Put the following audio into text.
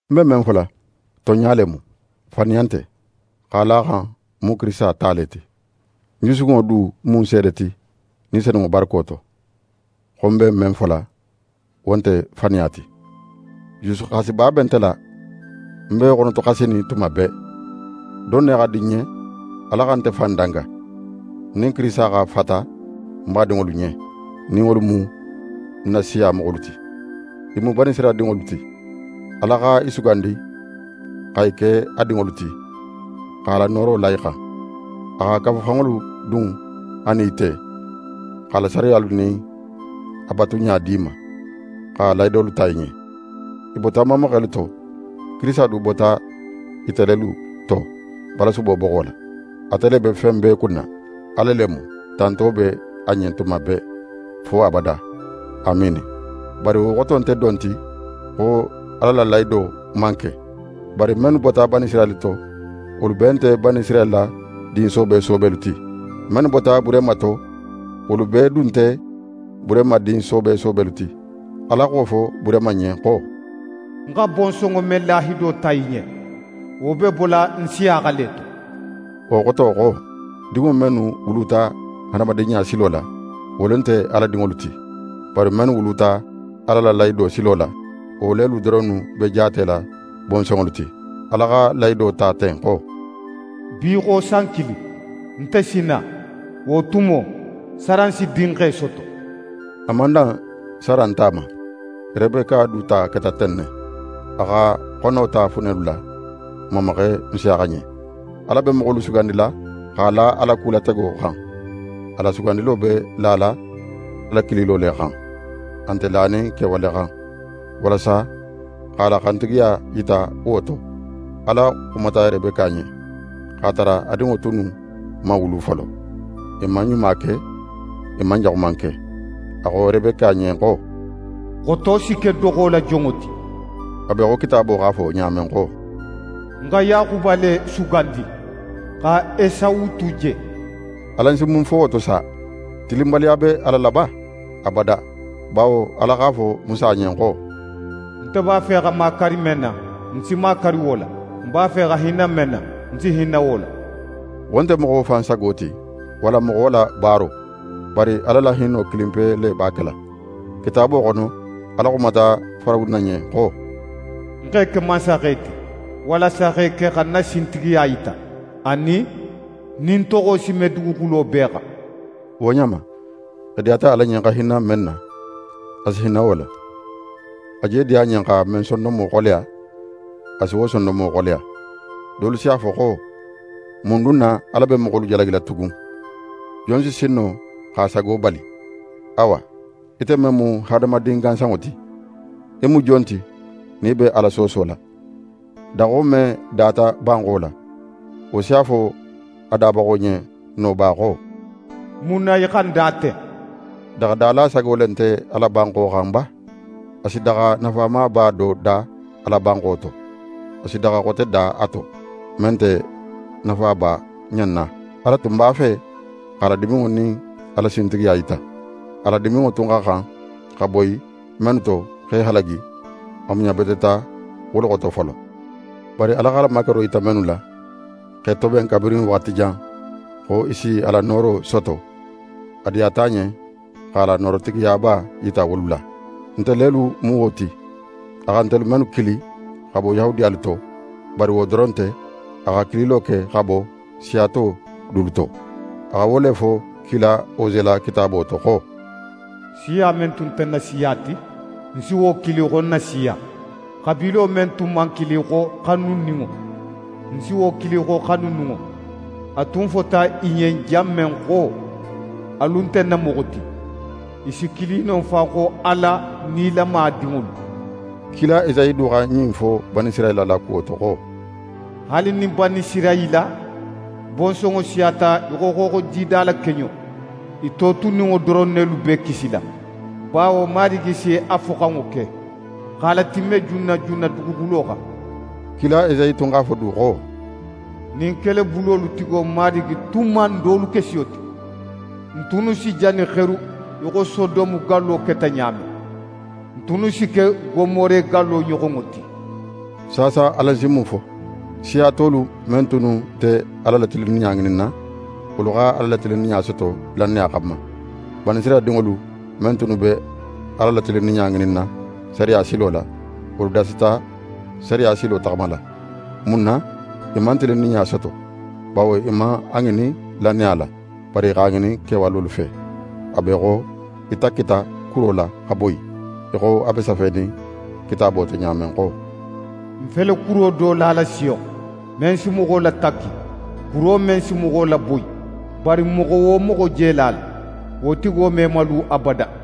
Ń be men fola, tonɲa le mu, faniya nte; x'a la a xan ń mu Kirisita ta le ti. Ń jusukunŋo du mu ń seede ti Ni Senunŋo barako to, xo ń be men fola, wo nte faniya ti. Jusuxasiba be nte la, ń be xonotoxasinin tuma bee. Don ne xa di ń ɲen Ala xa nte fan danga, ń nin Kirisita xa fata ń badinŋolu ɲen, nin wolu mu ń na siya moxolu ti. I mu Banisirayila dinŋolu ti. Ala xa i sugandi xa i ke a dinŋolu ti, x'a la nooro la i xan. A xa kafuxanŋolu dun a nin i te, x'a la sariyalu nin a batuɲa di i ma, xa lahidolu ta i ɲen. I bota n mamaxelu to. Kirisita du bota ite lelu to balasubo boxo la. Ate le be fen bee kunna. Ala le mu. Tanto be a ɲen tuma bee, fo abada. Amiini. Bari wo xoto nte don ti xo Ala la lahido man ke. Bawo mennu bota Banisirayila to, wolu bee nte Banisirayila din soobe soobelu ti. Mennu bota Burehima to, wolu bee du tun nte Burehima din soobe soobelu ti. Ala x'a fo Burehima ɲen xo: «Ń xa bonsonŋo men lahido ta í ɲen, wo be bola Nsiyaxa le to.» Wo xoto xo: Dinŋo mennu wuluta hadamadinɲa silo la, wolu nte Ala dinŋolu ti; bari mennu wuluta Ala la lahido silo la, wo lelu doronnu be jaatela bonsonŋolu ti. Ala xa lahido ta ten xo: «Bi xo san kilin, nte si na, wo tumo, Saran si dinxe soto.» A man dan Saran ta ma, Rebeka du ta keta ten ne. A xa xono ta funelu la n mamaxe Nsiyaxa ɲen. Ala be moxolu sugandila x'a la a la kulatego xan. A la sugandilo be lala a la kililo le xan; a nte lanin kewale xan. Walasa x'a la xantigiya yita wo to, Ala xumata Rebeka ɲen, x'a tara a dinŋo tunnu man wulu folo, i man ɲuma ke, i man jaxuman ke. A xo Rebeka ɲen xo: «Xoto si ke doxo la jonŋo ti.» A be í xo Kitaabo x'a fo ɲa men xo: «Ń xa Yaxuba le sugandi, xa Esawu tu je.» Alan si mun fo wo to sa? Tilinbaliya be Ala la ba? Abada! Bawo Ala x'a fo Musa ɲen xo: «Nte b'a fe xa makari men na, ń si makari wo la, ń b'a fe xa hinna men na, ń si hinna wo la.» Wo nte moxo fan sago ti, walla moxo la baaro, bari Ala la hinno kilinpe le b'a kela. Kitaabo xono, Ala xumata Farawuna ɲen xo: «Ń x'é ke mansaxe ti, walasa x'é ke xa ń na sintigiya yita, anin, nin ń toxo si me duguxulo bee xan.» Wo ɲa ma, a diyata Ala ɲen xa hinna men na, a si hinna wo la. A je diya a ɲen xa men sondonmo xoleya, a si wo sondonmo xoleya. Dolu si a fo xo: «Mun dun na Ala be moxolu jalagila tugun? Jon si sin no x'a sago bali?» Awa, ite men mu hadamadin gansanŋo ti, í mu jon ti nin í be Ala soosola? Daxo men data banxo la, wo si a fo a dabaxo ɲen no ba xo: «Mun na í xa ń da ten?» Daxadala sago le nte a la banxo xan ba? A si daxa nafamaba da a la banxo to, a si daxa xote da a to, men nte nafaba ɲan na. Ala tun b'a fe x'a la diminŋo nin a la sintigiya yita. A la diminŋo tun xa xan xa boyi mennu to x'e halagi, a muɲabeteta wolu xoto folo. Bari a x'a la makaro yita mennu la, x'e toben kabirin waxati jan xo i si a la nooro soto, a diyata a ɲen x'a la noorotigiyaba yita wolu la. Nte lelu mu wo ti, a xa ntelu mennu kili xa bo Yahudiyalu to, bari wo doron nte, a xa kililo ke xa bo siya to dulu to. A xa wo le fo kila Ose la kitaabo to xo: «Siya men tun nte ń na siya ti, ń si wo kili xo ń na siya. Xabiilo men tun man kili xo xanuninŋo, ń si wo kili xo xanuninŋo. A tun fota i ɲen jan men xo: “Alu nte ń na moxo ti”, i si kili non fan xo Ala nilama dinŋolu.» Kila Esayi du xa ɲin fo Banisirayila la kuwo to xo: «Haali nin Banisirayila bonsonŋo siyata í xo xooxojida la keɲo, i totuninŋo doron nelu be kisila. Bawo Marigi si a foxanŋo ke, x'a latimme junna junna duguxulo xan.» Kila Esayi tun x'a fo du xo: «Nin Kelebulolu tigo Marigi tun man n dolu ke siyo ti, n tunnu si jani xeru í xo Sodome gallo keta ɲa men. N tunnu si ke Gomore gallo ɲoxonŋo ti.» Saasa, alan si mun fo? Siya tolu men tunnu nte Ala la tilinninɲa ŋininna, wolu xa Ala la tilinninɲa soto lannaya xanma. Banisirayila dinŋolu men tunnu be Ala la tilinninɲa ŋininna sariya silo la, wolu dasata sariya silo taxamala. Mun na i man tilinninɲa soto? Bawo i man a ŋinin lannaya la, bari i x'a ŋinin kewalolu fe. A be í xo i takkita kuro la xa boyi, í xo a be safenin Kitaabo to ɲa men xo: «Ń fele kuro do lala Siyon, men si moxo latakki, kuro men si moxo laboyi. Bari moxo wo moxo je la a la, wo tigo me malu abada.»